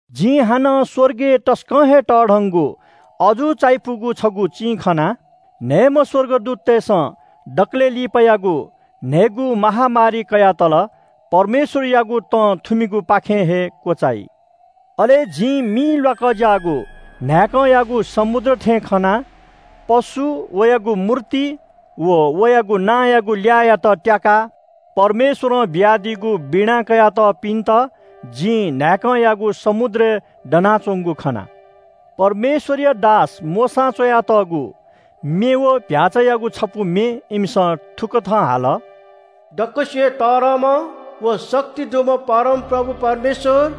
जिं हानं स्‍वर्गय् तसकं हे तःधंगु अजू चायापुगु छगू चिं खना। न्‍हय्‌म्‍ह स्‍वर्गदूततय्‌सं दकलय् लिपायागु न्‍हय्‌गू महामारी कयातल। परमेश्‍वरयागु तं थुमिगुपाखें हे क्‍वचाइ। अले जिं मि ल्‍वाकज्‍याःगु न्‍हाय्‌कंयागु समुद्र थें खना। पशु, वयागु मूर्ति व वयागु नांयागु ल्‍याःयात त्‍याकाः परमेश्‍वरं बियादीगु वीणा कयातःपिन्‍त जिं न्‍हाय्‌कंयागु समुद्रय् दनाच्‍वंगु खना। परमेश्‍वरया दास मोशां च्‍वयातःगु म्‍ये व चीधिकःम्‍ह भ्‍याःचायागु छपु म्‍ये इमिसं थुकथं हाल – “दक्‍वसिबय् तःधंम्‍ह व शक्ति दुम्‍ह परमप्रभु परमेश्‍वर,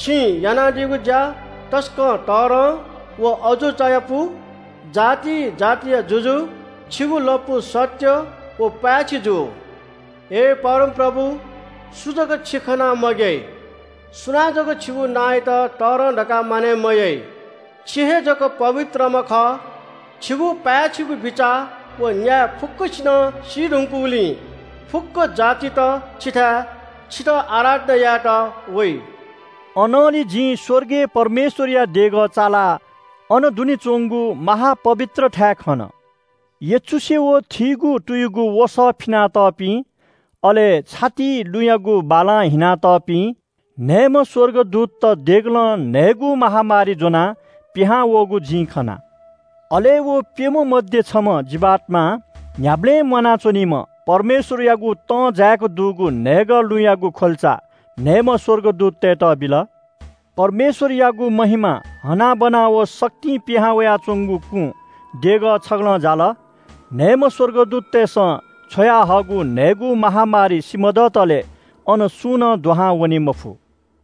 छिं यानादीगु ज्‍या तसकं तःधं व अजू चायापु। जाति जातिया जुजु, छिगु लँपु सत्‍य व पाय्‌छि जु। हे परमप्रभु, सु जक छि खनाः मग्‍याइ? सुनां जक छिगु नांयात तःधं धकाः मानय् मयाइ? छि हे जक पवित्रम्‍ह खः। छिगु पाय्‌छिगु बिचाः व न्‍याय फुक्‍कसिनं सी धुंकूगुलिं फुक्‍क जातित छिथाय् छितः आराधना यायेत वइ।” अनंलि जिं स्‍वर्गय् परमेश्‍वरया देगः चालाः अन दुने च्‍वंगु महा-पवित्र थाय् खन। यचुसे व थीगु तुयुगु वसः फिनातःपिं अले छातिइ लुँयागु बालां हिनातःपिं न्‍हय्‌म्‍ह स्‍वर्गदूतत देगलं न्‍हय्‌गू महामारी ज्‍वनाः पिहां वःगु जिं खना। अले व प्‍यम्‍ह मध्‍ये छम्‍ह जीवात्‍मां न्‍ह्याबलें म्‍वाना च्‍वनीम्‍ह परमेश्‍वरयागु तं जाय्‌क दुगु न्‍हय्‌गः लुँयागु ख्‍वल्‍चा न्‍हय्‌म्‍ह स्‍वर्गदूततय्‌त बिल। परमेश्‍वरयागु महिमा, हनाबना व शक्तिं पिहां वयाच्‍वंगु कुं देगः छगलं जाल। न्‍हय्‌म्‍ह स्‍वर्गदूततय्‌सं छ्वयाहःगु न्‍हय्‌गू महामारी सिमधःतले अन सुं नं दुहां वनेमफु।